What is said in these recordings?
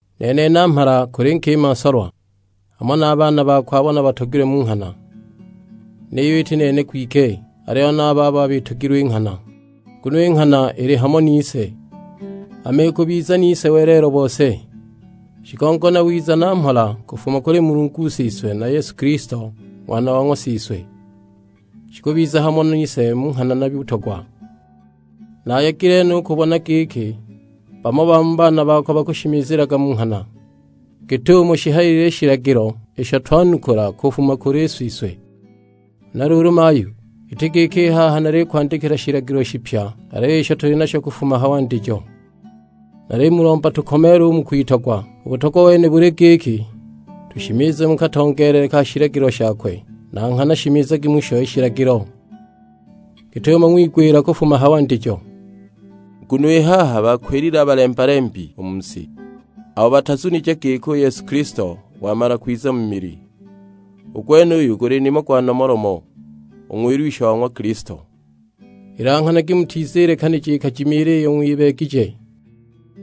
Nene namhala, kuli nkima nsolwa, hamo na baana bako abo nabatogilwe mu nghana; niyo iti nene kwike, aliyo na a babo bitogilwe i nghana. Nguno i nghana ili hamo nise, hama ikubiza nise welelo bose. Shigongo na wiza na mhola kufuma kuli Mulungu Siswe na Yesu Kilisto Ng'wana wa ng'wa Siswe, shikubiza hamo nise mu nghana na butogwa. Naayegile no u kubona giki bamo ba mu baana bako bakushimizilaga mu nghana, git'umo shihayilile i shilagilo isho twanukula kufuma kuli Siswe. Huna luulu mayu, iti giki i haha nalikwandikila shilagilo shipya, aliyo isho tuli nasho kufuma ha wandijo; nalimulomba tukomeele u mu kwitogwa. U butogwa wene buli giki, tushimize mu katongeelele ka shilagilo shakwe; na nghana shimizagi musho i shilagilo git'umo ng'wigwila kufuma ha wandijo. Nguno i haha bakwilile a balemba-lembi u mu si, abo batazunije giki u Yesu Kilisto wamala kwiza mu mili. U gwenuyu guli nimo gwa Nomolomo, u Ng'wilwisha wa ng'wa Kilisto. Ilanghanagi mutizilekanija ikajimiila iyo ng'wibeegije;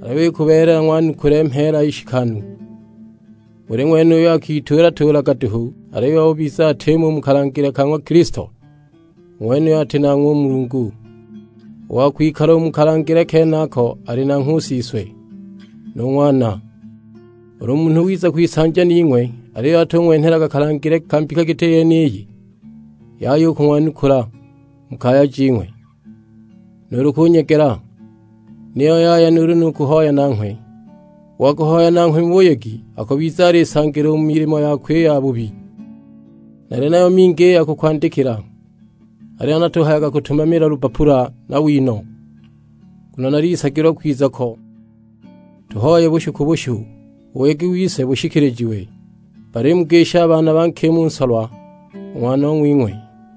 aliyo ikubeelela ng'wanukule mheela nshikanu. Buli ng'wene uyo akituula-tuulaga duhu aliyo ubiza atimo u mu kalangile ka ng'wa Kilisto, u ng'wenuyo ati nanghwe u Mulungu. U wa kwikala u mu kalangile kenako ali nanghwe u Siswe, nu Ng'wana. Ulu munhu wiza kwisanja ning'we aliyo atung'wenhelaga kalangile ka mbika giti yeniyi, yaya u kung'wanukula u mu kaya jing'we, nuulu kunyegela; niyo yaya nuulu ni kuhoya nanghwe. U wa kuhoya nanghwe mu buyegi, akubiza alisangila u mu milimo yakwe i yabubi. Nali nayo mingi i ya kukwandikila, aliyo natuhayaga kutumamila lubbapula na wino; nguno nalisagilwa kwiza ko tuhoye bushu ku bushu, u buyegi wise bushikilijiwe. Balimugisha a baana ba nkima u nsolwa, u ng'wanong'wing'we.